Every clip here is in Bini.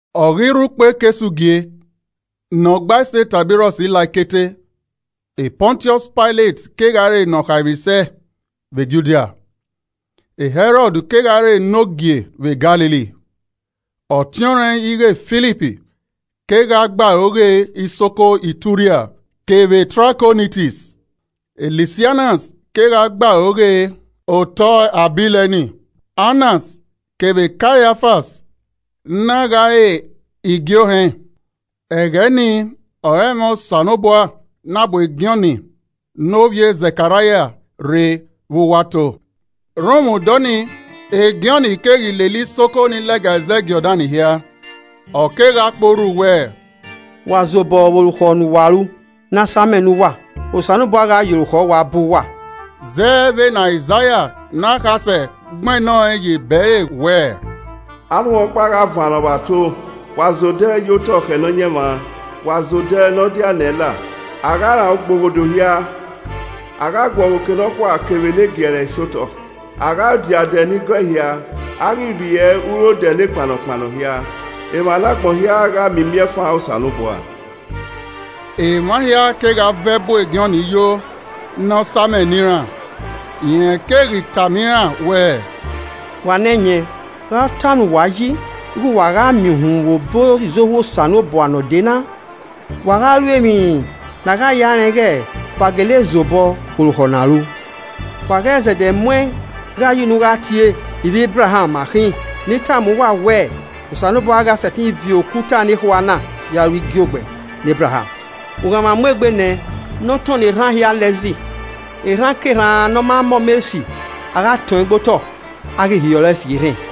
Ọ ghi rre ukpo ekesugie ne Ọgbaisi Taibirọs la ẹkete. Pọntiọs Pailet kegha re ne ọ khaemwisẹ vbe Judia Hẹrọd kegha re enogie vbe Galili, ọtiọnrẹn ighẹ Filip kegha gbe aro ghe isoko Ituria kevbe Trakonitis, Lisanias kegha gbe aro ghe otọ Abileni. Annas kevbe Kaiafan na gha re igie ohẹn. Ẹghẹ nii ọre ẹmwẹ Osanobua na bu e Jọn ne ovbi e Zẹkaraia rre vbe uwu ato. Rhunmwuda ọnii, e Jọn keghi lele isoko nii lẹga ẹzẹ Jọdan hia, ọ kegha kpe orhu wẹẹ, “Wa zobọ vbe orukhọ ne uwa ru, ne a samẹ ne uwa. Osanobua gha ye orukhọ uwa bọ uwa.” Zẹ vbene Aizaia ne akhasẹ gbẹnnẹ ọẹn ye ebe ẹre wẹẹ, “Arhunmwu ọkpa gha vannọ vbe ato: ‘Wa zẹ odẹ ye otọ khẹ Nọyaẹnmwa. Wa zẹ odẹ ne ọ diae nẹ ẹn la. A gha ran ugboghodo hia. A gha guọghọ oke nekhua kevbe ne giẹre hia sẹ otọ. A gha dia odẹ ni gọe hia. A ghi rriẹ urodẹ ne kpannọkpannọ hia. Emwa ne agbọn hia gha miẹn imiẹnfan Osanobua!’” Emwa hia kegha vẹ bu Jọn yo ne ọ samẹ ne iran. Rẹn keghi tama iran wẹẹ, “Wa ne ẹyẹn, gha ọ tama uwa yi ighẹ uwa gha miẹn uhunmwu vbe obọ izohu Osanobua ne ọ dee na? Wa gha ru emwi ne a gha ya rẹn ighẹ wa gele zobọ vbe orukhọ na ru. Wa ghẹ zẹdẹ mu ẹn gha ye unu gha tie, ‘Ivbi Ebraham ma khin.’ Ne I tama uwa wẹ, Osanobua gha sẹtin viọ okuta nekhua na, ya ru igiogbẹ ne Ebraham. Ughanmwa mu egbe nẹ ne ọ tọnnọ erhan hia la ẹzi. Erhankerhan ne ọ ma mọ ọmọ esi, a gha tọn ẹn gbe otọ, a ghi hiọrọ fi erhẹn.”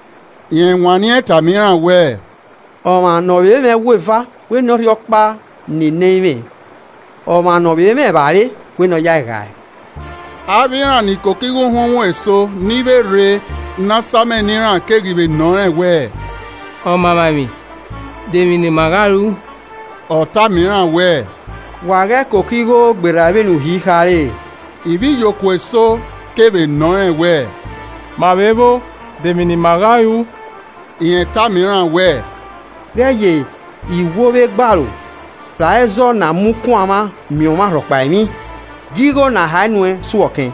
Rẹn wanniẹn tama iran wẹẹ, “Ọmwa ne ọ vbe mwẹ ẹwu eva, wẹ ne ọ rhie ọkpa ne ẹ i mwẹ, ọmwa ne ọ vbe mwẹ evbare, wẹ ne ọ yae ghae.” Avbe iran ni koko igho uhunmwu eso ni vbe rre ne a samẹ ne iran keghi vbe nọ rẹn wẹẹ, “Ọmamwaemwi, demwi ne ima gha ru?” Ọ tama iran wẹẹ, “Wa ghẹ koko igho gberra vbene uhi khare.” Ivbiyokuo eso kevbe nọ rẹn wẹẹ, “Ma vbe vbo? Demwi ne ima gha ru?” Rẹn tama iran wẹẹ, “Ghẹ ye iwo vbe egbe aro ra ẹzọ na mu kun ọmwa miẹn ọmwa rhọkpa emwi, gie igho ne a hae nuẹn su ọ ọkẹn.”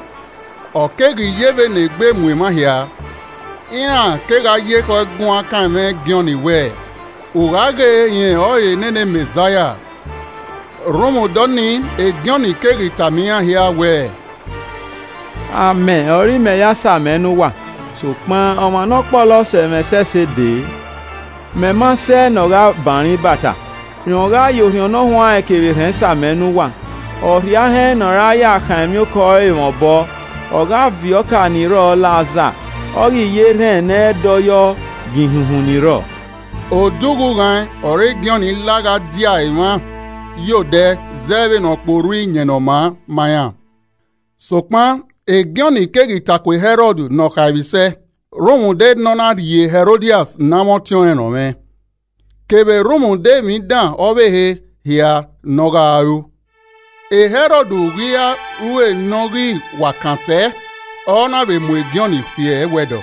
Ọ keghi yevbe ne egbe mu emwa hia, iran kegha ye ekhọe guan kan ẹmwẹ Jọn wẹ, ughaghe rẹn ọrọre nene Mẹzaia. Rhunmwuda ọnii Jọn keghi tama iran hia wẹẹ, “Amẹ ọre imẹ ya samẹ ne uwa, sokpan, ọmwa ne ọ kpọlọ sẹ mwẹ ẹsẹse dee. Mẹ ma sẹ ne ọ gha ban ẹre ibata. Rẹn ọre ọ gha ye orhiọn Ne ọ huanrẹn kevbe erhẹn same ne uwa. Ọ rhie ahẹn ne ọ ra ya khan emwiokọ ẹre mwẹ obọ, ọ gha viọ ọka ni rrọọ la aza, ọ ghi ye erhẹn ne ẹ i dọyọ giẹ ihunhun ni rrọọ.” Odẹ ughughan ọre Jọn la gha dia emwa ye odẹ zẹ vbene ọ kpe orhu Iyẹn Ne Ọ Maa ma iran. Sokpan Jọn keghi ta ku e Hẹrọd ne Ne ọ khaemwisẹ rhunmwuda ne ọ na rhie Hẹrodias ne amwẹ ọtiọnrẹn rọnmwẹ, kevbe rhunmwuda emwi dan ọvbehe hia ne ọ ghaa ru. Hẹrọd ghi ra ru e ne ọ ghi wa kan sẹ, ọ na vbe mu Jọn fi ẹwẹdọ.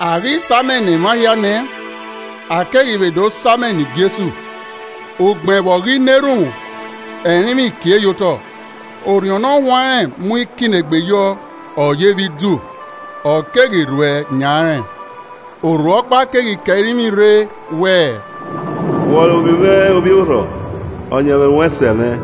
A ghi samẹ ne emwa hia nẹ, a keghi vbe do samẹ ne Jesu. Ugbẹn vbe ọ ghi na erhunmwu, ẹrinmwi kie ye otọ. Orhiọn Ne Ọ Huanrẹn mu ikinnegbe yọ, ọ yevbe idu, ọ keghi rhuẹ yan rẹn. Urhu ọkpa keghi ke ẹrinmwi rre wẹẹ, “Wẹ ọrọre ovbi mwẹ ovbi orrọ, ọyẹnmwẹ ruẹ sẹ mwẹ.”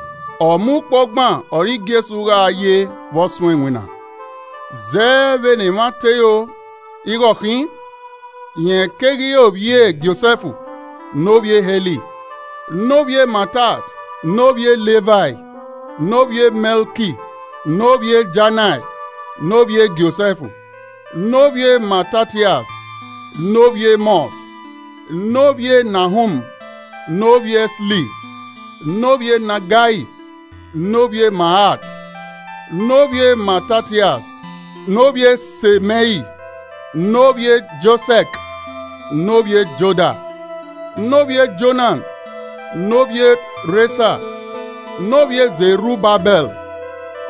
Ọmọ ukpo ọgban ọre Jesu gha ye vbe ọ suẹn iwinna. Zẹ vbene emwa te ro ighe ọ khin, rẹn keghi re ovbi e Josẹf ne ovbi e Heli. Ne ovbi Matat, ne ovbi e Livai, ne ovbi e Mẹlki ne ovbi e Janai, ne ovbi e Josẹf. Ne ovbi e Matatias, ne ovbi Emọs, ne ovbi e Nahum, ne ovbi Esli, ne ovbi e Nagai. Ne ovbi e Maat, ne ovbi e Matatias, ne ovbi e Semẹin, ne ovbi e Josẹk, ne ovbi e Joda. Ne ovbi e Jonan, ne ovbi e Rhesa, ne ovbi e Zerubabẹl,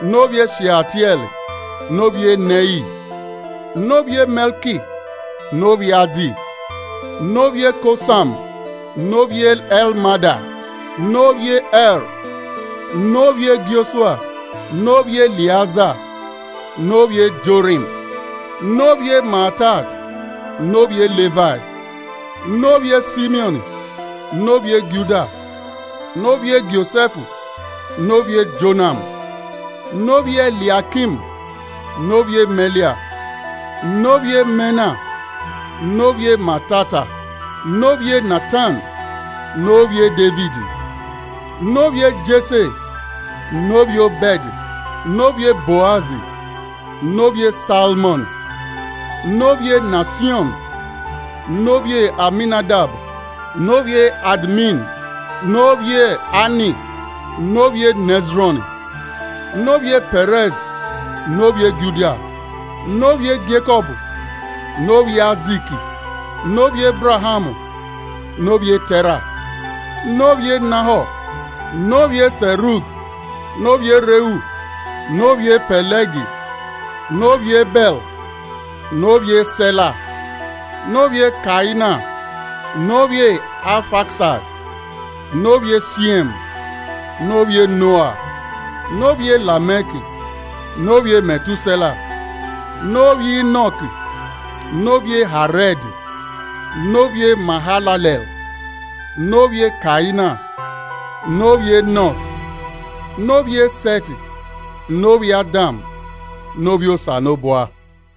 ne ovbi e Sheatiẹl, ne ovbi e Neri. Ne ovbi e Mẹlki, ne ovbi Addi, ne ovbi e Kosam ne ovbi e Elmada, ne ovbi e Er. Ne ovbi e Jọsua, ne ovbi Eliaza, ne ovbi e Jorim, ne ovbi e Matat, ne ovbi e Livai. Ne ovbi e Simiọn, ne ovbi e Juda, ne ovbi e Josẹf ne ovbi e Jonam, ne ovbi e Eliaikim. Ne ovbi e Melia, ne ovbi e Mena, ne ovbi e Matata, ne ovbi e Natan, ne ovbi e Devid. Ne ovbi e Jese, ne ovbi e Obẹd, ne ovbi e Boaz, ne ovbi e Salmọn, ne ovbi e Nasiọn. Ne ovbi Aminadab, ne ovbi Admin, ne ovbi Ani ne ovbi e Nẹzrọn, ne ovbi e Pẹrẹs, ne ovbi e Juda. Ne ovbi e Jekọb, ne ovbi Aizik ne ovbi Ebraham ne ovbi e Tẹra, ne ovbi e Nahọ. Ne ovbi e Sevug, ne ovbi e Rẹu ne ovbi e Pẹlẹg ne ovbi Ebẹ ne ovbi e Sẹla. Ne ovbi e Kaina, ne ovbi Afaksad, ne ovbi e Siẹm, ne ovbi e Noa, ne ovbi e Lamẹk. Ne ovbi e Mẹtusẹla, ne ovbi Inọk, ne ovbi e Harẹd ne ovbi e Mahalale, ne ovbi e Kaina. Ne ovbi Ẹnọs, ne ovbi e Sẹt, ne ovbi Adam, ne ovbi e Osanobua.